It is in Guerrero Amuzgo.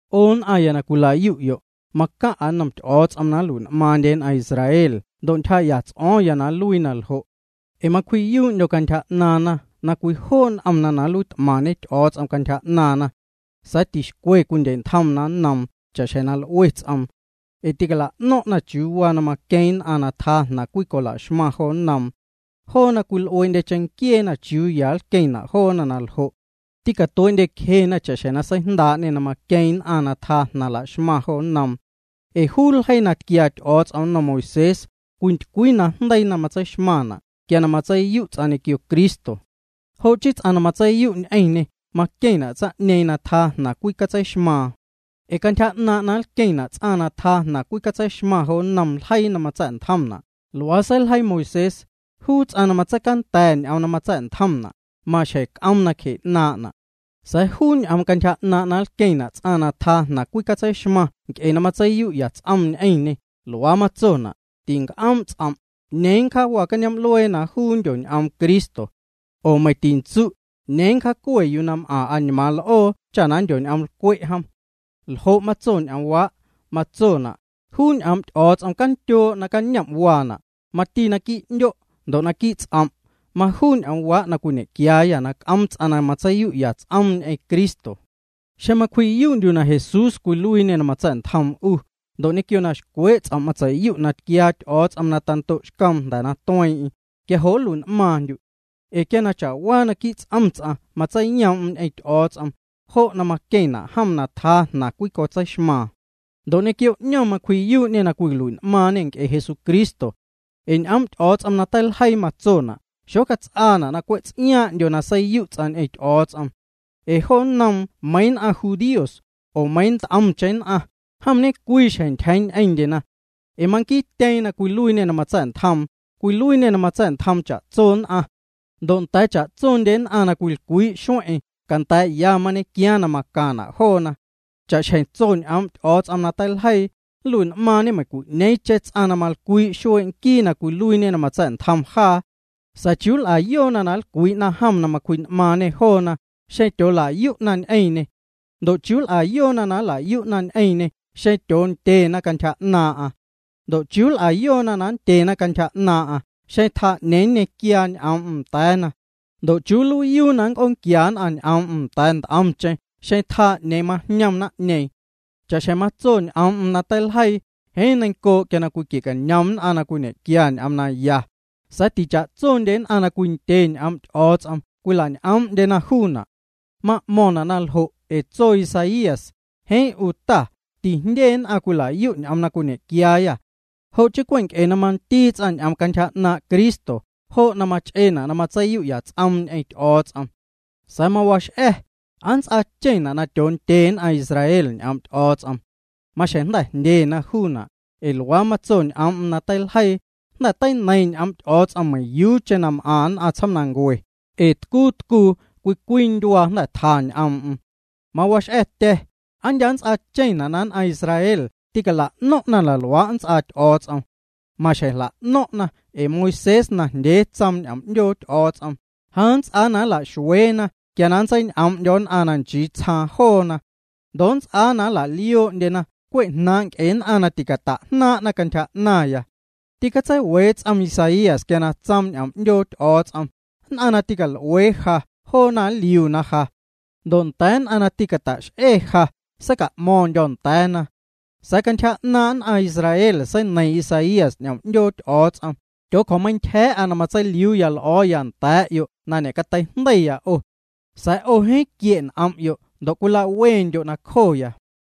'O nn'aⁿya na cwila'yu'yo', macaⁿ'a nnom Ty'o̱o̱ts'om na nlui'n'maaⁿndye nn'aⁿ Israel ndo' ntyjaa'ya ts'o̱o̱ⁿya na nluii na ljo'. Ee macwji'yuu'ndyo̱ cantyja 'naaⁿna na cwijoo' n'omna na nluiit'maⁿñe Ty'o̱o̱ts'om cantyja 'naaⁿna. Sa̱a̱ ticwixcwe na cwindye'ntjomna nnoom cha'xjeⁿ na l'ue ts'oom. Ee tîcala'no̱ⁿ'na chiuu waa na maqueeⁿ nn'aⁿ na tjaa jnaⁿ cwicola'xmaⁿ jo nnoom. Joona cwil'uee'ndye cheⁿnquieena chiuu ya na nlqueⁿna' joona na ljo'. Tîcatuee'ndyecjena cha'xjeⁿ na seijndaa'ñê na maqueeⁿ nn'aⁿ na tjaa jnaⁿ laxmaⁿ jo nnoom. Ee juu ljeii na tquiaa Ty'o̱o̱ts'om nnom Moisés, cwintycwii najndeii na matseixmaⁿna' quia na matseiyu' ts'aⁿ ñequio Cristo. Jo' chii ts'aⁿ na matseiyu' ñ'eⁿñê, maqueⁿna' tsaⁿ'ñeeⁿ na tjaa jnaⁿ cwicatseixmaaⁿ. Ee cantyja 'naaⁿ' na nlqueⁿna' ts'aⁿ na tjaa jnaⁿ cwicatseixmaⁿ jo nnom ljeii na matsa̱'ntjomna', luaa seiljeii Moisés: “Juu ts'aⁿ na matseicanda̱ ñ'oom na matsa̱'ntjomna', maxjeⁿ c'oom nacje 'naaⁿ'na'.” Sa̱a̱ juu ñ'oom cantyja 'naaⁿ' na nlqueⁿna' ts'aⁿ na tjaa jnaⁿ cwicatseixmaⁿ nc'e na matseiyu'ya ts'om ñ'eⁿñê, luaa matsona': “Tinc'oom' ts'om': ¿'Ñeeⁿ nncjaawa cañoom'luee na juu nndyoñ'oom Cristo? Oo meiⁿ tintsu': 'Ñeeⁿ nncjaacue yuu na m'aⁿ añmaaⁿ l'oo” cha na nndyoñ'oomlcwe' jom. ¿Ljo' matso ñ'oomwaa'?: ’Matsona': “Juu ñ'oom' Ty'o̱o̱ts'om candyoo' nacañom' waana', mati naquii' 'ndyo' ndo' naquii' ts'om'.” Majuu ñ'oomwaa' na cwiñe'quiaayâ na c'oom ts'aⁿ na matseiyu'ya ts'oom ñ'eⁿ Cristo. Xeⁿ na macwji'yuu'ndyu' na Jesús cwiluiiñê na matsa̱'ntjoom 'u, ndo' ñequio na xcwee' ts'om' matseiyu' na tquiaa Ty'o̱o̱ts'om na tando'xcoom jnda̱ na tueeⁿ'eⁿ, quia jo' nlui'n'maaⁿndyu'. Ee quia ñequio cha'waa ts'om ts'aⁿ matseiyoom'm ñ'eⁿ Ty'o̱o̱ts'om, jo' na maqueⁿna' jom na tjaa jnaⁿ cwicatseixmaaⁿ. Ndo' ñequio 'ñom macwji'yuu'ñê na cwilui'n'maaⁿñe nc'e Jesucristo. Ee ñ'oom' Ty'o̱o̱ts'om na teiljeii matsona': “Xocats'aana' na cwe' ts'iaaⁿ'ndyo na seiyu' ts'aⁿ ñ'eⁿ Ty'o̱o̱ts'om.” Ee jo nnoom meiiⁿ nn'aⁿ judíos, oo meiiⁿ nt'omcheⁿ nn'aⁿ, jom ñecwii xjeⁿ ntyjeeⁿ ñ'eⁿndye joona. Ee manquiiti na cwiluiiñe na matsa̱'ntjom, cwiluiiñê na matsa̱'ntjoom cha'tso nn'aⁿ. Ndo' nda̱a̱ cha'tsondye nn'aⁿ na cwilcwii'na xueⁿ'eⁿ, canda̱a̱'ya mañequiaaⁿ na macaⁿna' joona. Cha'xjeⁿ tso ñ'oom' Ty'o̱o̱ts'om na teiljeii: “Nlui'n'maaⁿñe meiⁿcwi'ñeeⁿcheⁿ ts'aⁿ na malcwii' xuee' nquii na cwiluiiñe na matsa̱'ntjom jaa.” Sa̱a̱ ¿chiuu nl'ayoona na nlcwii'na jom na cwji'n'maaⁿñê joona xeⁿ na tyoola'yu'na ñ'eⁿñê? ¿Ndo' chiuu nl'ayoona na nla'yu'na ñ'eⁿñê xeⁿ tyoondyena cantyja 'naaⁿ'aⁿ? Ndo' ¿chiuu nl'ayoona na nndyena cantyja 'naaⁿ'aⁿ xeⁿ tjaa 'ñeeⁿ nñequiaa ñ'oom'm nda̱a̱na? Ndo' ¿chiuu nluiiyuu na nnc'oonquia nn'aⁿ ñ'oom'm nda̱a̱ nt'omcheⁿ xeⁿ na tjaa 'ñeeⁿ majñom naⁿ'ñeeⁿ? Cha'xjeⁿ matso ñ'oom'm na teiljeii: “Jeeⁿ neiⁿncoo' quia cwiquie'cañom nn'aⁿ na cwiñequia ñ'oom naya.” Sa̱a̱ ticha'tsondye nn'aⁿ na cwindye ñ'oom' Ty'o̱o̱ts'om cwilañ'oom'ndyena juuna'. Ma'mo̱ⁿna' na ljo' ee tso Isaías: “Jeeⁿ 'u Ta, tijndye nn'aⁿ cwila'yu' ñ'oom na cwiñequiaayâ.” Jo' chii cwe' nc'e na mandii ts'aⁿ ñ'oom cantyja 'naaⁿ' Cristo, jo' na mawee'na' na matseiyu'ya ts'om ñ'eⁿ Ty'o̱o̱ts'om. Sa̱a̱ mawax'a̱: ¿Aa nnts'aacheⁿna' na tyoondye nn'aⁿ Israel ñ'oom' Ty'o̱o̱ts'om? Maxjeⁿ jnda̱ jndyena juuna', ee luaa matso ñ'oom'm na teiljeii: Jnda̱ teineiⁿ ñ'oom' Ty'o̱o̱ts'om meiⁿyuucheⁿ na m'aⁿ nn'aⁿ tsjoomnancue, ee tcuu tcuu cwii cwii ndyuaa jnda̱ tja ñ'oom'm. Mawax'a̱tya̱: ¿Aa ndya' nnts'aacheⁿna' na nn'aⁿ Israel tîcala'no̱ⁿ'na na luaa' nnts'aa Ty'o̱o̱ts'om? Maxjeⁿ jla'no̱ⁿ'na ee Moisés najndyee tsoom ñ'oom 'ndyoo Ty'o̱o̱ts'om: Ja nnts'aaya na nla'xueena quia na nntseiñ'oom'ndyo̱ nn'aⁿ na nchii tsjaaⁿ joona. Ndo' nnts'aa na nla'lioo'ndyena cwe' jnaaⁿ' nc'e nn'aⁿ na ticata'jnaaⁿ'na cantyja 'naⁿya. Tîcatseiwee ts'om Isaías quia na tsoom ñ'oom 'ndyoo Ty'o̱o̱ts'om: Nn'aⁿ na tîcal'uee ja joona jliuna ja. Ndo' nda̱a̱ nn'aⁿ na tîcata'x'e ja, seica'mo̱ⁿndyo̱ nda̱a̱na. Sa̱a̱ cantyja 'naaⁿ nn'aⁿ Israel seineiⁿ Isaías ñ'oom 'ndyoo Ty'o̱o̱ts'om: “Tyoocjo̱meintyja̱a̱'a na matseiliuuya l'o̱o̱ya nda̱a̱'yo' na ñe'cateijndeiya 'o. Sa̱a̱ 'o jeeⁿ quie' n'om'yo' ndo' cwila'wendyo' nacjoya.”